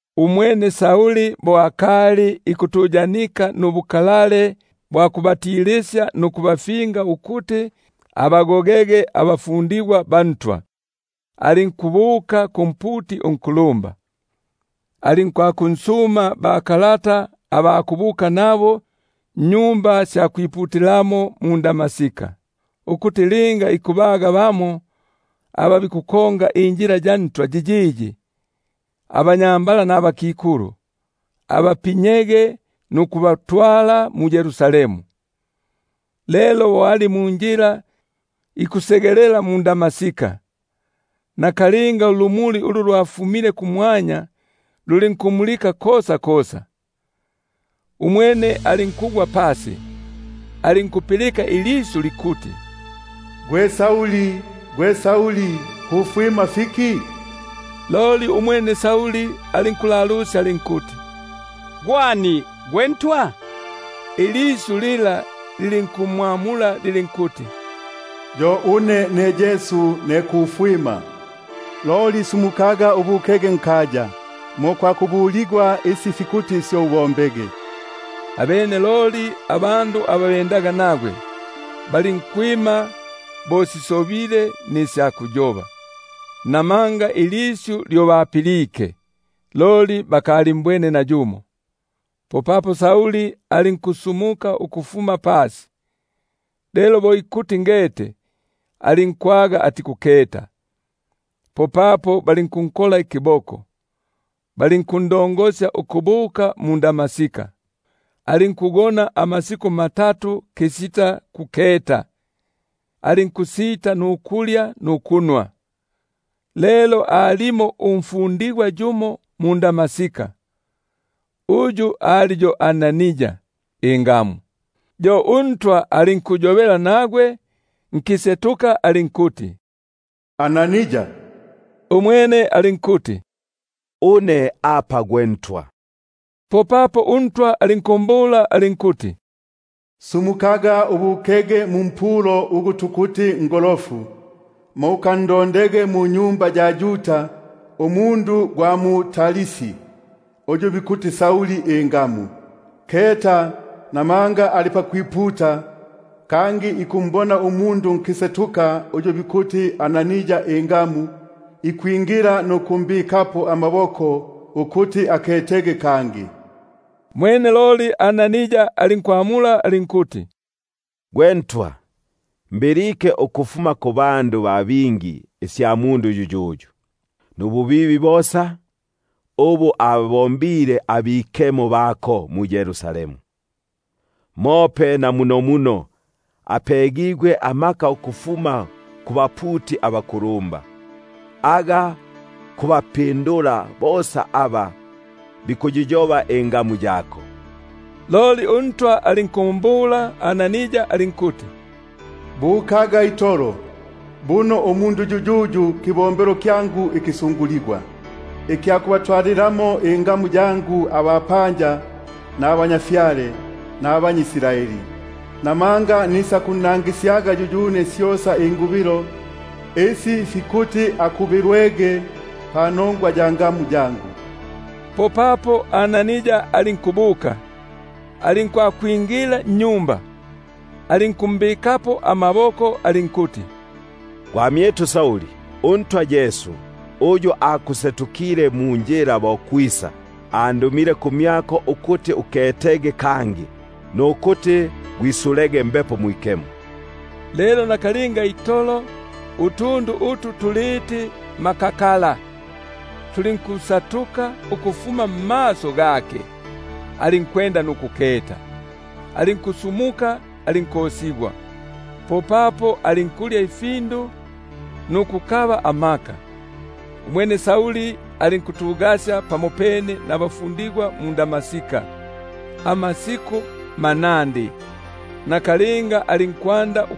Umwene Sauli bo akali ikutuyanika nubukalale bwa kubogofya nukubagoga abafundigwa ba Ntwa, alinkubuka kumputi unkulumba, alinkwakunsuma bakalata aba kubuka nabo mmaSinagogi ga mu-Damaska, ukuti linga ikubaga bamo aba njila yiyiyi, abanyambala nabakikulu, abapinyege nukubatwala muYerusalemu. Lelo bo ali munjila ikusegelela mu-Damaska, nakalinga ulumuli ulufuma kumwanya luli- nkummulika kosa kosa; umwene alinkugwa pasi, alinkupilika ilisyu likuti: Gwe Sauli, gwe Sauli, kufwima fiki une? Loli umwene alinkulalusya alinkuti: Gwe ani, gwe Ntwa? Umwene alinkumbula alinkuti: Yo une Yesu ne kufwima; loli sumukaga ubukege nkaya, mo kwakubuligwaga isi fikuti ubombege. Abene loli abandu aba bendaga nagwe, balinkwima bo sisobile nisya kuyoba, namanga ilisyu lyo balipilike, loli balinkusita nukumbona nayumo. Popapo Sauli alinkusumuka ukufuma pasi, lelo bo ikuti ngete, alinkwaga atikuketa. Popapo balinkunkola ikiboko, balinkundongosya ukubuka mu-Damaska. Alinkugona amasiku matatu kisita kuketa, alinkusita nukulya nukunwa. Lelo alimo umfundigwa yumo mu-Damaska, uyu ali yo Anania ingamu; yo uNtwa alinkuyobela nagwe nkisetuka alinkuti: Anania! Umwene alinkuti: Alʼune gwe Ntwa. Popapo uNtwa alinkumbula alinkuti: Sumukaga ubukege mumpulo ugu bikuti Ngolofu, mo ukandondege munyumba ya Yuda umundu gwa mu Tarsi, uyu bikuti Sauli ingamu. Keta, buno ali pakwiputa, kangi ikumbona umundu nkisetuka uyu bikuti Anania ingamu, ikwingila nukumbikapo amaboko ukuti aketege kangi. Umwene loli Anania alinkwamula alinkuti: Gwe Ntwa, mbilike ukufuma kubandu ba bingi isya mundu yuyuyu, nububibi bosa ubu ababombile abikemo bako mu-Yerusalemu; mope na munomuno apegigwe amaka ukufuma kubaputi abakulumba, aga kubapinyila bosa aba bikuyiyoba ingamu yako. Loli uNtwa alinkumbula alinkuti: Bukaga, buno umundu yuyuyu kibombelo kyangu ikisunguligwa, ikya kubatwalilamo ingamu yangu abapanja, nabatwa, nabanyʼIsraeli; buno nisakunnangisyaga yuyune syosa ingu- bilo isi fikuti akubilwege panongwa ya ngamu yangu. Popapo Anania alinkubuka, alinkwakwingila nnyumba, alinkumbikapo amaboko alinkuti: Gwamyitu Sauli, uNtwa Yesu, uyu akusetukile munjila bo kwisa, andumile kumyako ukuti uketege kangi, nukuti gwisulege Mbepo Mwikemo. Lelo nakalinga itolo utundu utu tuliti makakala lulinkusatuka ukufuma mmaso gake, alinkwenda nukuketa. Alinkusumuka alinkosigwa. Popapo alinkulya ifindu nukukaba amaka. Umwene alinkuya pamopene nabafundigwa aba mu- Damaska amasiku manandi. Nakalinga alinkumfumusya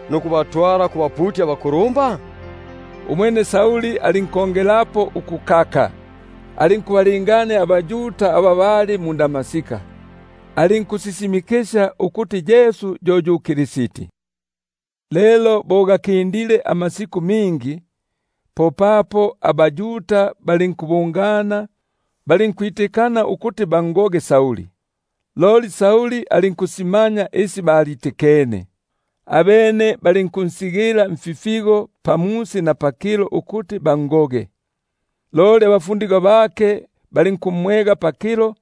nukubatwala kubaputi abakulumba? Umwene Sauli alinkongelapo ukukaka, alinkubalangania abaYuda aba bali mu-Damaska, alinkusisimikisya ukuti Yesu yo yu Kristi. Lelo bo gakindilepo amasiku mingi, popapo abaYuda balinkwitikana ukuti bangoge, loli Sauli alinkusimanya isi balitikene. Abene balinkunsigila mfipata pamusi na pakilo ukuti bangoge; loli abafundigwa bake balinkumwega pakilo,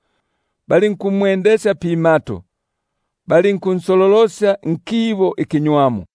balinkumwendesya pimato, balinkunsololosya nkitundu.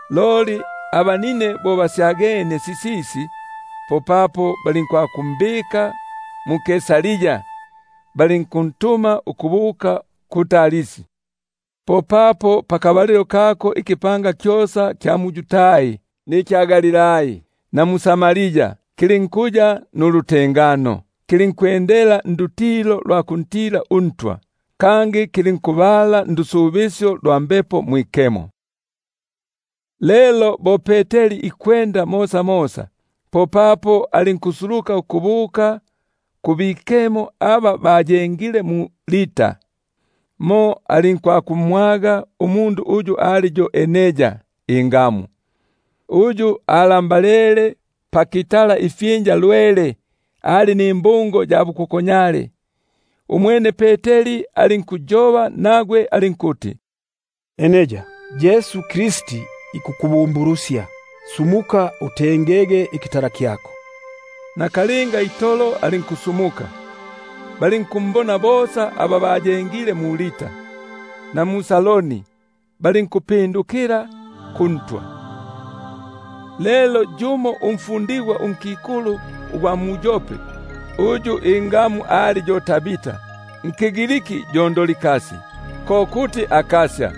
Loli abanine bo basyagenie, popapo balinkwakumbika mu-Kaisaria balinkuntuma ukubuka mu-Tarsi. Popapo ikipanga kyosa kya mu-Yudai, mu-Galilai, na mu-Samaria, kilinkutengana nukwiyenga, kilinkwendela ndutilo lwa kuntila uNtwa; kangi kilinkubala ndusubisyo lwa Mbepo Mwikemo. Lelo bo Peteri ikwembela mosamosa, popapo alinkusuluka ukubuka kubikemo aba bayengile mu-Lida. Mo alinkwakumwaga umundu uyu ali yo Enea ingamu, uyu alambalele pakitala ifyinja lwele, ali nimbungo ya bukokonyale. Umwene Peteri alinkuyoba nagwe alinkuti: Enea, Yesu Kristi ikukubumbulusya: sumukaga, gwitengelege ikitala kyako. Naka- linga itolo alinkusumuka. Balinkumbona bosa aba bayengile mu-Lida, na mu-Saroni, balinkupindukila kuNtwa. Lelo alimo yumo umfundigwa unkikulu mu-Yope, uyu ingamu yake ali yo Tabita, ko kuti Dorkasi;#Dorkasi ko kuti akasya.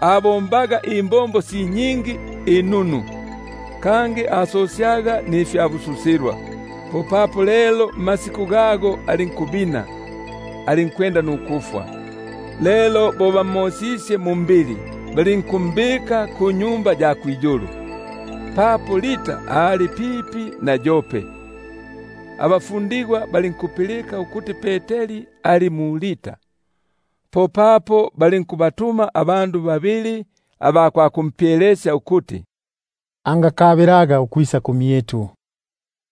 ali nimbombo inunu si nyingi, kangi asosyaga nifyabususilwa. Lelo mmasiku gago alinkubina, alinkwenda nukufwa. Lelo bo bamosisye mumbili, balinkumbika kunyumba ya kwiyulu. Papo Lida ali pipi na Yope, abafundigwa balinkupilika ukuti Peteri ali mumo; popapo balinkubatuma abandu babili aba kwakumpyelesya ukuti: Ungakabilaga ukwisa kumyitu.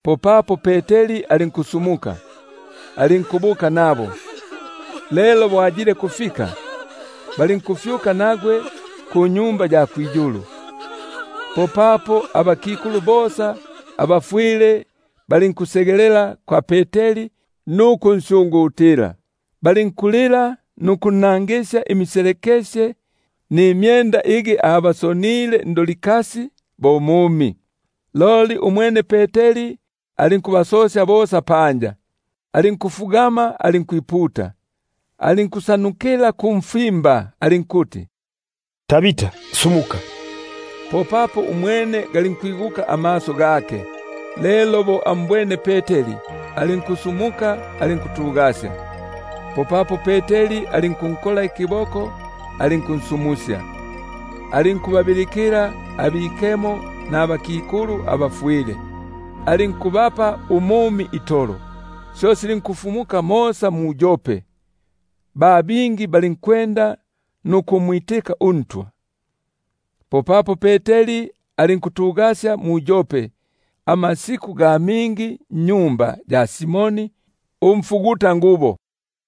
Popapo Peteri alinkusumuka, alinkubuka nabo. Lelo bo ayilekufika, balinkufyuka nagwe kunyumba ya kwiyulu. Popapo abakikulu bosa abafwile balinkusegelela kumyake, balinkulila nukunnangisya imiselekesye nimyenda, igi Dorkasi abasonile, bo akali ali nabo. Loli umwene Peteri alinkubasosya bosa panja, alinkufugama alinkwiputa, alinkusyutukila kumfimba alinkuti: Tabita, sumuka. Popapo umwene alinkwigula amaso gake; lelo bo ambwene Peteri, alinku- sumuka alinkutugasya. Popapo Peteri alinkunkola ikiboko, alinkunsumusya; alinkubabilikila abikemo nabakikulu aba- fwile, alinkubapa umumi itolo. Syo silinkufumuka mosa mu-Yope, ba bingi balinkwenda nukumwitika uNtwa. Popapo Peteri alinkuya mu-Yope amasiku ga mingi nnyumba ya Simoni umfugutangubo.